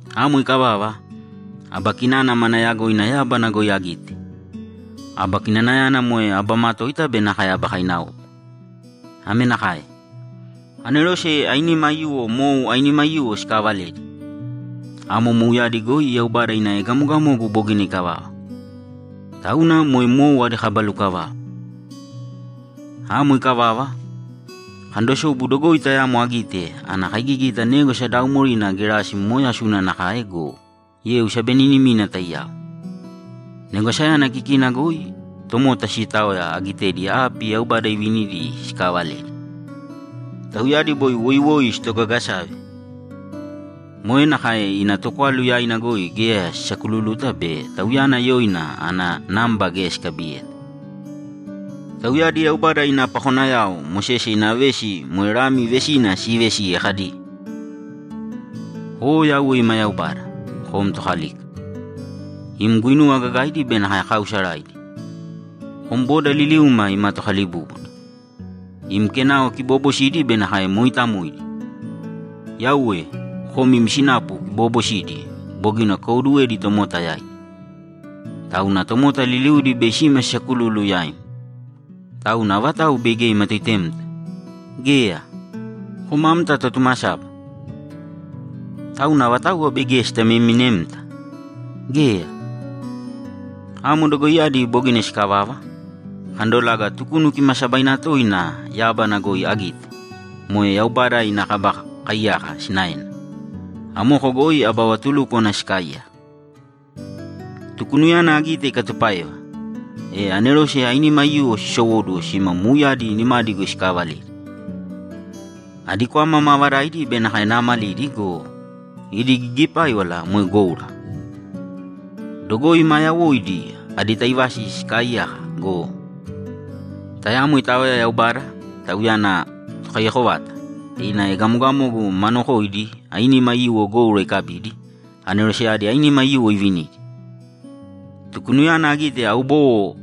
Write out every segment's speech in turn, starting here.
Amo ikavava, aba kinana mana yagoina yábana goi agite. Aba kinanayana moe aba matoita be nakae aba kainaopa. Ame nakae: Anerose ainima aiyuwo mou ainima aiyuwo sikaavaledi. Amo mouyadi goi Yaubada ina egamogamogu bogina ikavava. Tauna moe mou adi kaba lukavava. Amo ikavava, akandosobu dogoi tayamo agite ana kaigigita négwasa daaumorina gerasi momooyasuna nakae go, yeu sabeninimina taiyao. Negwasayana kikina goi tomota siitaoya agitedi api Yaubada ivinidi sikaavaledi. Tauyadi boi woiwoi sitogagasave. Moe nakae ina tokwalu yaina goi geya sisakululuta be tauyana yoina ana namba geya sikabiyeta. Tauyadi Yaubada ina pakonayao Mosese ina vesi moe Lami vesina siivesiye kadi, ‘O Yauwe ima Yaubada, kom Tokalika. Im guinuwa gagaidi be nakae kaausaraidi! Kom boda liliuma ima Tokalibúbuna, im kenao kiboobosidi be nakae mooitamoidi! Yauwe, kom im sinapu kiboobosidi bogina kukaiwoduwedi tomota yaidi. Tauna tomota liliudi bei sima sisakululu yaim. Tauna avatau bei geya imatoitemta? Geya! Kom amta Totumasaba. Tauna avatauwa bei geya sitaimaminemta? Geya!’ Amo dogoiyadi bogina sikavava, akandobala Tukunu Kimaasabaina Toina yábana goi agite, moe Yaubada ina Kaba Kaiyaka sinaena. Amoko goi aba vatulúkwana sikaaiyaka. Tukunuyana agite ikatupáeva, e anerose ainima aiyuwo sisowóduwo sima mouyadi nimadi goi sikaavaledi. Adi kwama maavadaidi be nakae naamalidi go, idi gigipáiwala moe goura. Dogoi maa yawoidi adi taivasi sikaaiyaka go, tayamo itaoya Yaubada, Tauyana Tokaiyako vata, ina egamogamogu ma nokoidi ainima aiyuwo goura ikabidi, aneroseyadi ainima aiyuwo ivinidi. Tukunuyana agite aubowo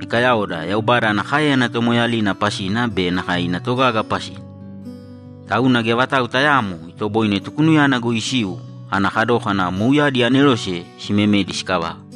ikayaoda Yaubada ana káeyana tomoeeyalina pasina be nakae ina togaga pasina. Tauna geya vatau tayaamo itoboine Tukunuyana goi isiu ana kadókana mouyadi anerose simemedi sikavava.